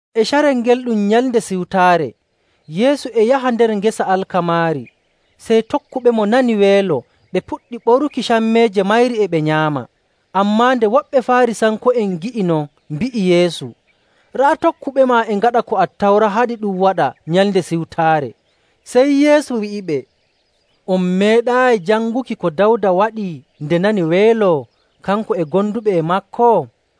E carel ngel ɗum Nyalnde Siwtaare. Yeesu e yaha nder ngesa alkamaari, sey tokkuɓemo nani weelo ɓe puɗɗi ɓoruki cammeeje mayri e ɓe nyaama.. Ammaa nde woɓɓe Faarisanko'en ngi'i non, mbi'i Yeesu, “Raa tokkuɓema e ngaɗa ko Attawra haɗi ɗum waɗa Nyalnde Siwtaare.” Sey Yeesu wi'iɓe, “On meeɗaayi janguki ko Dawda waɗi nde nani weelo, kanko e gonduɓe e maako?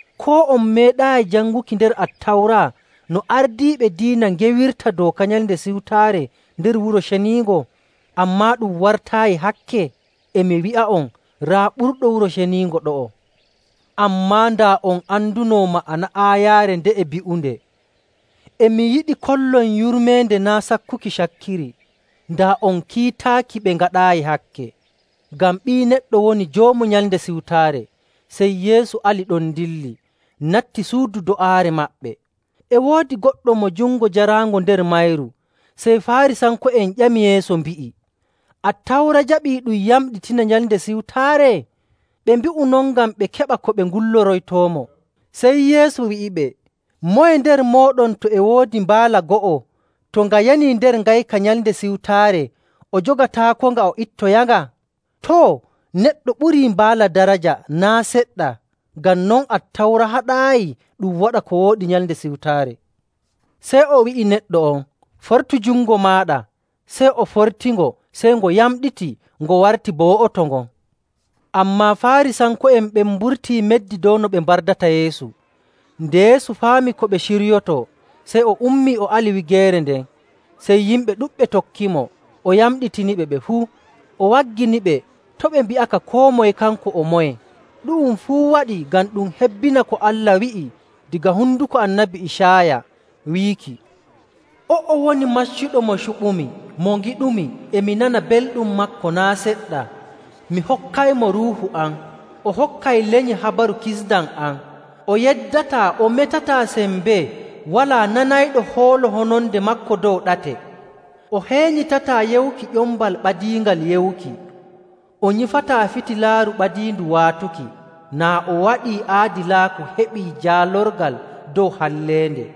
Koo on meeɗaayi janguki nder Attawra no ardiiɓe diina ngewirta dooka Nyalnde Siwtaare nder Wuro Ceniingo, ammaa ɗum wartaayi hakke?. E mi wi'a'on, raa ɓurɗo Wuro Ceniingo ɗo'o. Ammaa daa on andunoo ma'ana aayaare nde'e bi'unde, ‘E mi yiɗi kollon yurmeende, naa' sakkuki cakkiri,’ daa on kiitaaki ɓe ngaɗaayi hakke.. Ngam Ɓii Neɗɗo woni Joomu Nyalnde Siwtaare.” Sey Yeesu ali ɗon dilli, natti suudu do'aare maɓɓe. E woodi goɗɗo mo jungo jaraango nder mayru. Sey Faarisanko'en ƴami Yeesu, mbi'i, “Attawra jaɓii ɗum yamɗitina Nyalnde Siwtaare?” Ɓe mbi'u non ngam ɓe keɓa ko ɓe ngulliroytoomo. Sey Yeesu wi'iɓe, “Moye nder mooɗon to e woodi mbaala go'o to nga yanii nder ngayka Nyalnde Siwtaare, o jogataakonga o ittoyanga? Too! Neɗɗo ɓurii mbaala daraja naa' seɗɗa! Ngam non, Attawra haɗaayi ɗum waɗa ko wooɗi Nyalnde Siwtaare.”. Sey o wi'i neɗɗo on, “Fortu jungo maaɗa.” Sey o fortingo, sey ngo yamɗiti, ngo warti bo wo'oto ngon. Ammaa Faarisanko'en ɓen mburtii meddi dow no ɓe mbardata Yeesu. Nde Yeesu faami ko ɓe ciryotoo, sey o ummii o ali wigeere nden. Sey yimɓe ɗuɗɓe tokkimo, o yamɗitiniɓe ɓe fuu, o wagginiɓe to' ɓe mbi'aka koo moye kanko o moye. Ɗu'um fuu waɗii ngam ɗum hebbina ko Allah wi'i daga honduko Annabi Icaaya, wiiki, “O'o woni maccuɗo mo cuɓumi, mo ngiɗumi, e mi nana belɗum maako naa' seɗɗa. Mi hokkaymo Ruuhu am, o hokkay lenyi habaru kisndam am. O yeddataa o metataa sembee, walaa nanayɗo hoolo hononde maako dow ɗate. O heenyitataa yewuki ƴombal ɓadiingal yewuki. O nyifataa fitilaaru ɓadiindu waatuki, naa o waɗii aadilaaku heɓi jaalorgal dow halleende.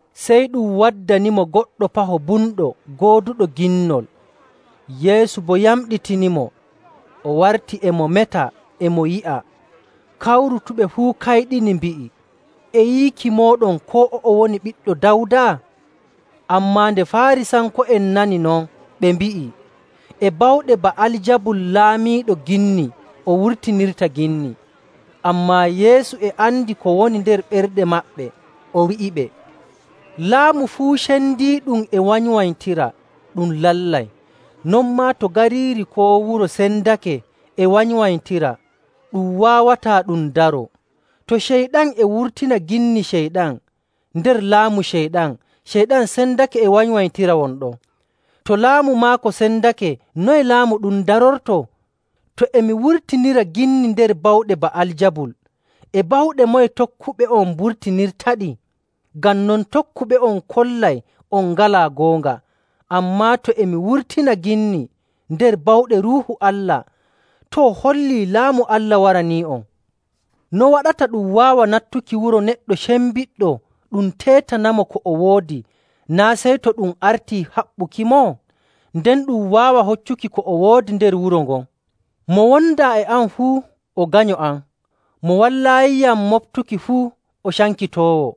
Sey ɗum waddanimo goɗɗo paho bumɗo gooduɗo ginnol. Yeesu boo yamɗitinimo, o warti e mo meta, e mo yi'a. Kawrutuɓe fuu kayɗini, mbi'i, “E yiiki mooɗon koo o'o woni Ɓiɗɗo Dawda?” Ammaa nde Faarisanko'en nani non, ɓe mbi'i, “E bawɗe Ba'aljabul laamiiɗo ginni o wurtinirta ginni.”. Ammaa Yeesu e andi ko woni nder ɓerɗe maɓɓe, o wi'iɓe, “Laamu fuu cendiiɗum e wanywanytira, ɗum lallay. Non maa to gariiri koo wuro sendake e wanywanytira, ɗum waawataa ɗum daroo. To Ceyɗan e wurtina ginni Ceyɗan nder laamu Ceyɗan, Ceyɗan sendake e wanywanytira won ɗon. To laamu maako sendake, noye laamu ɗum darortoo? To e mi wurtinira ginni nder bawɗe Ba'aljabul, e bawɗe moye tokkuɓe'on mburtinirtaɗi? Ngam non tokkuɓe'on kollay on ngalaa goonga. Ammaa, to e mi wurtina ginni nder bawɗe Ruuhu Allah, too, hollii Laamu Allah waranii'on. “No waɗata ɗum waawa nattuki wuro neɗɗo cembiɗɗo ɗum teetanamo ko o woodi, naa' sey to ɗum artii haɓɓukimo? Nden ɗum waawa hoccuki ko o woodi nder wuro ngon. “Mo wondaa e am fuu, o ganyo am. Mo wallaayiyam moɓtuki fuu, o cankitoowo..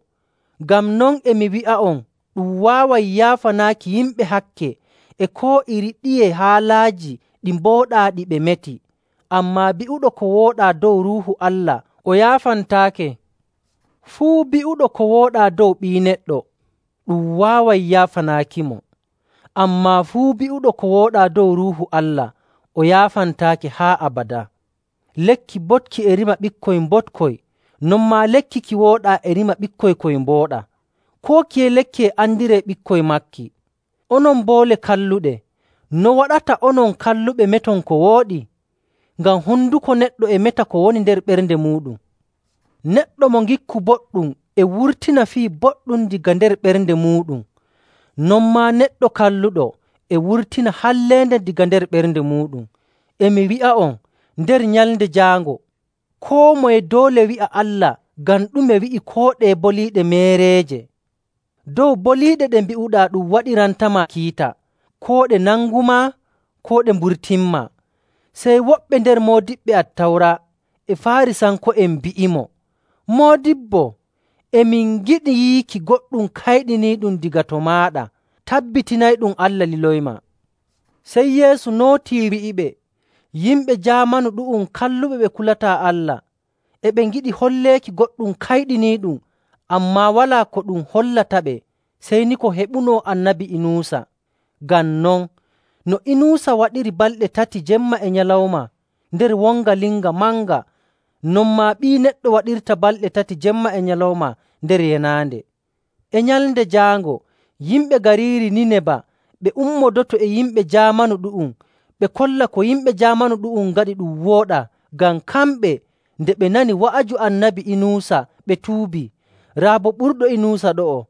Ngam non, e mi wi'a'on, ɗum waaway yaafanaaki yimɓe hakke e koo iri ɗiye haalaaji ɗi mbooɗaa ɗi ɓe meti, ammaa bi'uɗo ko wooɗaa dow Ruuhu Allah o yaafantaake. Fuu bi'uɗo ko wooɗaa dow Ɓii Neɗɗo, ɗum waaway yaafanaakimo. Ammaa fuu bi'uɗo ko wooɗaa dow Ruuhu Allah, o yaafantaake haa abadaa.. “Lekki boɗki e rima ɓikkoy mboɗkoy, non maa lekki ki wooɗaa e rima ɓikkoy koy mbooɗaa. Koo kiye lekki e andiree ɓikkoy maaki.. Onon boole kalluɗe! No waɗata onon kalluɓe meton ko wooɗi? Ngam honduko neɗɗo e meta ko woni nder ɓernde muuɗum.. Neɗɗo mo ngikku boɗɗum e wurtina fii boɗɗum daga nder ɓernde muuɗum. Non maa neɗɗo kalluɗo e wurtina halleende daga nder ɓernde muuɗum. “E mi wi'a'on, nder Nyalnde Jaango koo moye doole wi'a Allah ngam ɗume wi'i koo ɗeye boliiɗe meereeje. Dow boliiɗe ɗe mbi'uɗaa ɗum waɗirantama kiita, koo ɗe nangumaa, koo ɗe mburtinmaa.” Sey woɓɓe nder moodiɓɓe Attawra e Faarisanko'en mbi'imo, “Moodibbo, e min ngiɗi yiiki goɗɗum kayɗiniiɗum daga to maaɗa tabbitinayɗum Allah liloymaa.”. Sey Yeesu nootii, wi'iɓe, “Yimɓe jaamanu ɗu'um kalluɓe ɓe kulataa Allah, e ɓe ngiɗi holleeki goɗɗum kayɗiniiɗum, ammaa walaa ko ɗum hollataɓe sey ni ko heɓuno Annabi Inuusa.. Ngam non, no Inuusa waɗiri balɗe tati jemma e nyalawma nder wonga linga manga, non maa Ɓii Neɗɗo waɗirta balɗe tati jemma e nyalawma nder yenaande.. E Nyalnde Jaango yimɓe gariiri Niineba ɓe ummodoto e yimɓe jaamanu ɗu'um. Ɓe kolla ko yimɓe jaamanu ɗu'um ngaɗi ɗum wooɗaa, ngam kamɓe, nde ɓe nani wa'aju Annabi Inuusa, ɓe tuubii. Raa boo ɓurɗo Inuusa ɗo'o..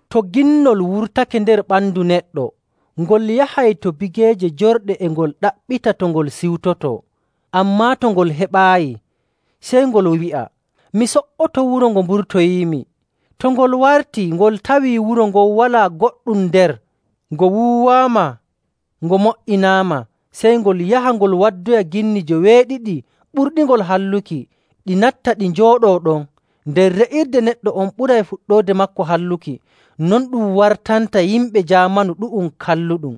“To ginnol wurtake nder ɓandu neɗɗo, ngol yahay to bigeeje jorɗe e ngol ɗaɓɓita to ngol siwtotoo. Ammaa to ngol heɓaayi, sey ngol wi'a, ‘Mi so''oto wuro ngo mburtoyiimi.’ To ngol wartii, ngol tawii wuro ngon walaa goɗɗum nder, ngo wuuwaama ngo mo''inaama. Sey ngol yaha ngol waddoya ginni joweeɗiɗi ɓurɗingol halluki, ɗi natta ɗi njooɗoo ɗon. Nden re'irde neɗɗo on ɓuray fuɗɗoode maako halluki. Non ɗum wartanta yimɓe jaamanu ɗu'um kalluɗum.”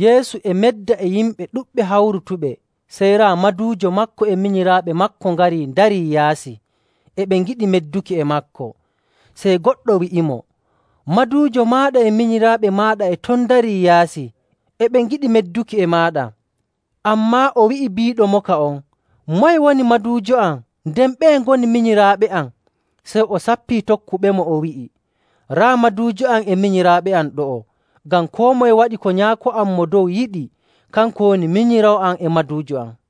Yeesu e medda e yimɓe ɗuɗɓe hawrutuɓe, sey raa maduujo maako e minyiraaɓe maako ngari ndarii yaasi, e ɓe ngiɗi medduki e maako. Sey goɗɗo wi'imo, “Maduujo maaɗa e minyiraaɓe maaɗa e ton ndarii yaasi, e ɓe ngiɗi medduki e maaɗa.” Ammaa o wi'i biiɗomoka on, “Moye woni maduujo am, nden ɓeye ngoni minyiraaɓe am?” Sey o sappii tokkuɓemo, o wi'i, “Raa maduujo am e minyiraaɓe am ɗo'o! Ngam koo moye waɗi ko Nyaako am Mo Dow yiɗi, kanko woni minyiraawo am e maduujo am.”